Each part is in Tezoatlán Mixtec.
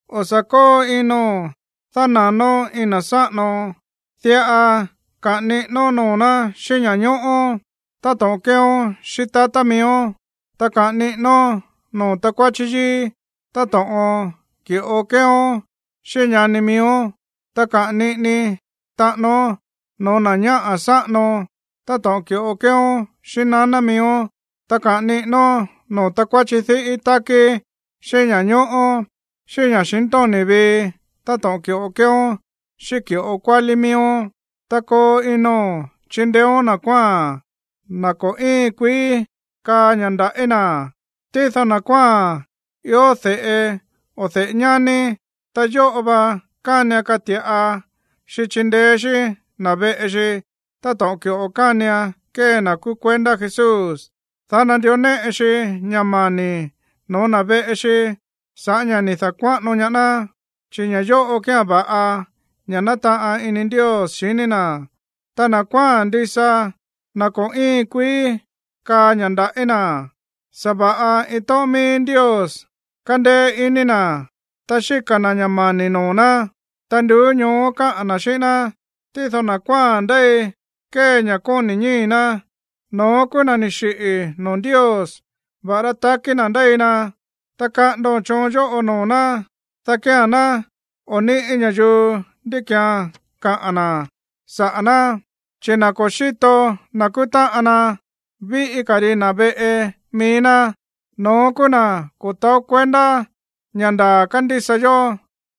O̱ sa̱ kóo ino̱n dána̱nón iin na̱ sáꞌano, diꞌa kaꞌa̱n niꞌínón noo̱ ná xíꞌín ña̱ñóꞌó táto̱ꞌon kéeón xíꞌín tatá miíón. Ta kaꞌa̱n niꞌínón noo̱ takuáchí yíí táto̱ꞌon ki̱ꞌo kéeón xíꞌín ñani miíón. Ta kaꞌa̱n niꞌini taꞌánón no̱ó na̱ ñáꞌa̱ sáꞌano táto̱ꞌon ki̱ꞌo kéeón xíꞌín naná miíón. Ta kaꞌa̱n niꞌínón noo̱ takuáchí diꞌí tákí xíꞌín ña̱ñóꞌó, xíꞌín ña̱xintóni̱ vii, táto̱ꞌon ki̱ꞌo kéeón xíꞌín ki̱ꞌo kuálí miíón. Ta koo ino̱n chindeéón na̱ kuáa̱n, na̱ ko̱ íin kuií kaá ña̱ nda̱ꞌí na̱. Tído na̱ kuáa̱n ió de̱ꞌe o de̱ꞌe ñání, ta yóꞌo va kánian kati̱ꞌa xi chindeé xí na̱ veꞌe xi táto̱ꞌon ki̱ꞌo kánian kee na̱ kúú kuendá Jesús, dá nandió néꞌe xi ña̱ mani̱ no̱ó na̱ veꞌe xi sa̱ꞌá ña̱ ni̱ da̱kuáꞌano ñaá ná, chi̱ ña̱ yóꞌo kía̱n va̱ꞌa, ña̱ nátaꞌan ini Ndios xiní na̱. Ta na̱ kuáa̱n ndisa, na̱ ko̱ íin kuií kaá ña̱ nda̱ꞌí na̱, sa̱va̱ꞌa iin tóꞌón mií Ndios kándéé iní na̱, ta xíka̱ na̱ ña̱ mani̱ noo̱ ná, ta nduú ñoó káꞌa̱n na̱ xíꞌín ná. Tído na̱ kuáa̱n ndéi kée ña̱ kóni̱ ñíi̱ ná, no̱ón kúú na̱ ni̱ xiꞌi̱ noo̱ Ndios, va̱ꞌará takí na̱ ndéi na. Ta kaꞌa̱ndo̱n choon yóꞌo noo̱ ná, dá kía̱n ná o̱ níꞌi̱ ña̱yuu ndí ki̱án kaꞌa̱n na̱ saꞌa̱ ná. Chi̱ na̱ ko̱ xíto na̱ kúú táꞌan na, víꞌí ka̱ ri na̱ veꞌe mií ná, no̱ón kúú na̱ ko̱ taó kuendá ña̱ ndaa̱ kándísa yó,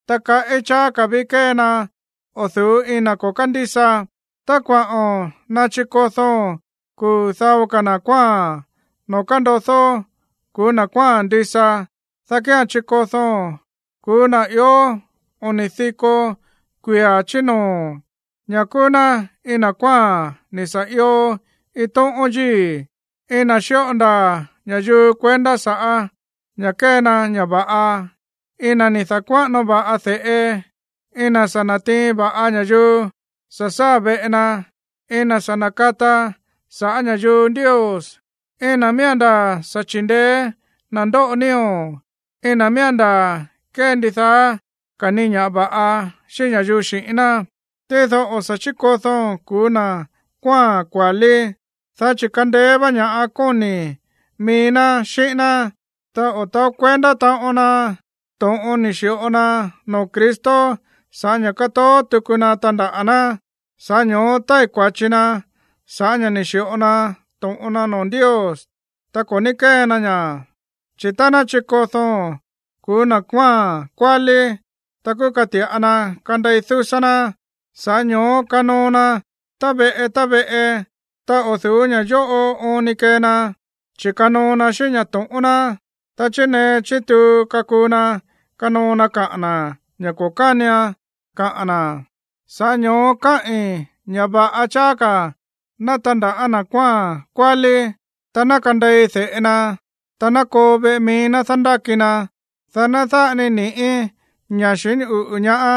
ta kaꞌí cháá ka̱ ví kée na o̱ du̱ú iin na̱ ko̱ kándísa. Tá kuaꞌo̱n nachikodóo̱n kuu̱ dao ka̱ na̱ kuáa̱n noo̱ kandodó ku̱ú na̱ kuáa̱n ndisa, dá kía̱n chikodóo̱n kuu̱ na̱ ió oni̱ diko kuia̱ chí noo̱, ñá kúú ná iin na̱ kuáa̱n ni̱ sa̱ io iin tóꞌón yíi̱, iin na̱ xíꞌo ndaa̱ ña̱yuu kuendá sa̱ꞌá ña̱ kée na ña̱ va̱ꞌa, iin na̱ ni̱ da̱kuáꞌano va̱ꞌa de̱ꞌe, iin na̱ sa̱ na̱tiin va̱ꞌa ña̱yuu sa̱ sáa̱ veꞌe na, iin na̱ sa̱ na̱kata saꞌa̱ ña̱yuu Ndios, iin na̱ miía̱n ndaa̱ sa̱ chi̱ndeé na̱ ndóꞌo nío̱, iin na̱ miía̱n ndaa̱ kée ndidaá ka̱ ni ña̱ va̱ꞌa xíꞌín ña̱yuu xi̱ꞌín ná. Tído o̱ sa̱ chíkodóo̱n ku̱ú na̱ kuáa̱n kua̱lí, dá chi̱ kandeé vá ña̱ kóni̱ mií ná xíꞌín ná, ta o̱ taó kuendá taꞌon na to̱ꞌon ni̱ xi̱ꞌo na noo̱ Cristo sa̱ꞌá ña̱ katoó tuku na tandaꞌa̱ ná. Sa̱ꞌá ño̱ó tái̱ kua̱chi na sa̱ꞌá ña̱ ni̱ xi̱ꞌo na to̱ꞌon na noo̱ Ndios, ta ko̱ ní kée na ña̱. Chi̱ tá ná chikodóo̱n ku̱ú na̱ kuáa̱n kua̱lí, ta kúú kati̱ꞌa na kandei dúsá ná, sa̱ꞌá ño̱ó kanoo na tá veꞌe tá veꞌe. Ta o̱ du̱ú ña̱ yóꞌo oon ni kee na, chi̱ kanoo na xíꞌín ña̱ to̱ꞌón ná, ta chinee chituu kakuu na kanoo na kaꞌa̱n na̱ ña̱ ko̱ kánian kaꞌa̱n na̱. Sa̱ꞌá ño̱ó káꞌi̱n ña̱ va̱ꞌa cháá ka̱ ná tandaꞌa̱ na̱ kuáa̱n kua̱lí, ta ná kandei de̱ꞌe na, ta ná koo veꞌe mií ná dándáki na, dá ná dáꞌa ni ni̱ꞌí ña̱ xiní uꞌu̱ ñaá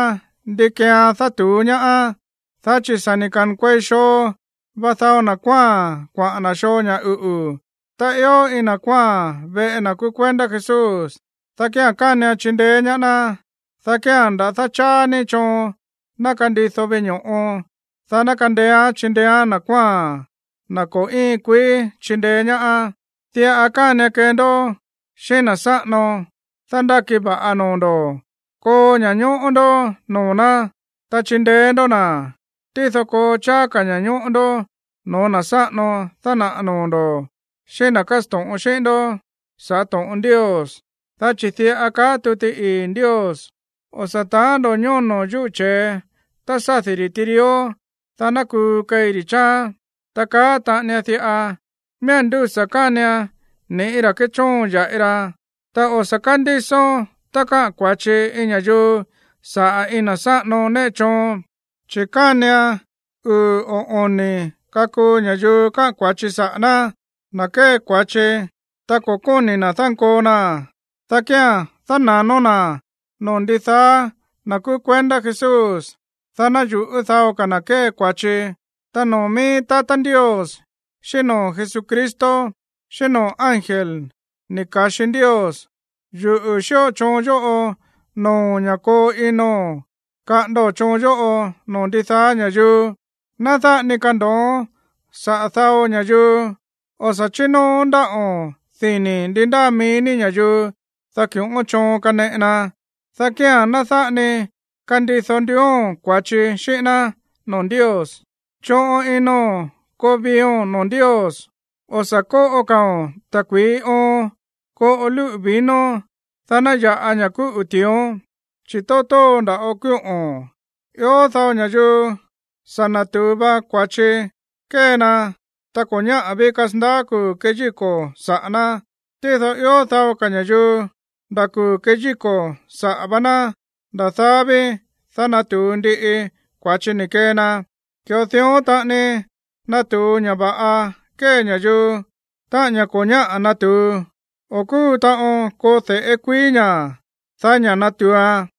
ndi keean dátu̱ú ñaáán. Dá chi̱ sa̱ ni̱ ka̱nkuei xoo va dao na̱ kuáa̱n kuaꞌa̱n na̱ xoo ña̱ uꞌu̱. Tá ió iin na̱ kuáa̱n veꞌe na̱ kúú kuendá Jesús, dá kía̱n kánian chindeé ñaá ná, dá kía̱n nda̱dá cháá ni choon ná kandido veꞌe ño̱ꞌo, dá ná kandeéán chindeéán na̱ kuáa̱n, na̱ ko̱ íin kuií chindeé ñaá. Diꞌa kánian kee ndó xíꞌín na̱ sáꞌano dándáki va̱ꞌa noo̱ ndo̱: koo ña̱ñóꞌó ndó noo̱ ná, ta chindeé ndó na̱, tído koo cháá ka̱ ña̱ñóꞌó ndó no̱ó na̱ sáꞌano dánaꞌa̱ noo̱ ndo̱, xíꞌín na̱ kásto̱ꞌon xíꞌín ndó sa̱ꞌá to̱ꞌon Ndios. Dá chi̱ diꞌa kaá tuti ii̱ Ndios: “O̱ sa̱ taán ndo̱ ñóno̱ yuꞌú che̱e tá sádi̱ ri̱ tirió, dá ná kuu keí ri̱ chááán.” Ta kaá taꞌanian diꞌa: “Miía̱n ndúsa̱ kánian ni̱ꞌí ra̱ kéchóon ya̱ꞌi ra.” Ta o̱ sa̱ kándísón tá káꞌa̱n kua̱chi iin ña̱yuu sa̱ꞌá iin na̱ sáꞌano néꞌe choon, chi̱ kánian uu̱ o oni̱ kakuu ña̱yuu kaꞌa̱n kua̱chi saꞌa̱ ná. Na̱ kée kua̱chi, ta ko̱ kóni̱ na̱ dánkoo naa̱n, dá kía̱n dána̱nón na̱ noo̱ ndidaá na̱ kúú kuendá Jesús, dá ná yu̱ꞌú dao ka̱ na̱ kee na kua̱chi. Ta noo̱ mií tatá Ndios, xíꞌín noo̱ Jesucristo, xíꞌín noo̱ ángel ni̱ ka̱xi Ndios, yuꞌu̱ xíꞌo choon yóꞌo noo̱o̱n ña̱ koo ino̱n kaꞌa̱ndo̱n choon yóꞌo noo̱ ndidaá ña̱yuu. Ná dáꞌa ni kando̱oón saꞌa̱ dao ña̱yuu. O̱ sa̱ chínóoón ndáꞌo̱n dini̱ ndi ndáa mií ní ña̱yuu, dá ki̱ꞌón choon kaneꞌe na, dá kía̱n ná dáꞌa ni kandido nduúón kua̱chi xíꞌín ná noo̱ Ndios. Choꞌon ino̱n koo viio̱n noo̱ Ndios. O̱ sa̱ kóꞌo ka̱o̱n ta̱kui̱í oon. Koꞌo lúꞌu̱ vino, dá ná ya̱ꞌa ña̱ kúꞌu̱ ti̱ión, chi̱ tóo tóo nda̱ꞌo kúꞌo̱n. Ió dao ña̱yuu sa̱ na̱tu̱u va kua̱chi kée na tá ko̱ ñáꞌa̱ ví kasandaá kuu̱ keyíko̱ saꞌa̱ ná. Tído ió dao ka̱ ña̱yuu, nda̱ kuu̱ keyíko̱ saꞌa̱ vá ná, nda̱ daá ví, dá natu̱u ndiꞌi kua̱chi ni̱ kee na. Ki̱ꞌo dión taꞌani natu̱u ña̱ va̱ꞌa kée ña̱yuu. Táꞌa̱n ña̱ ko̱ ñáꞌa̱ natu̱u, o̱ kúu taꞌon koo de̱ꞌé kuií ña̱, daí ña̱ natu̱uan.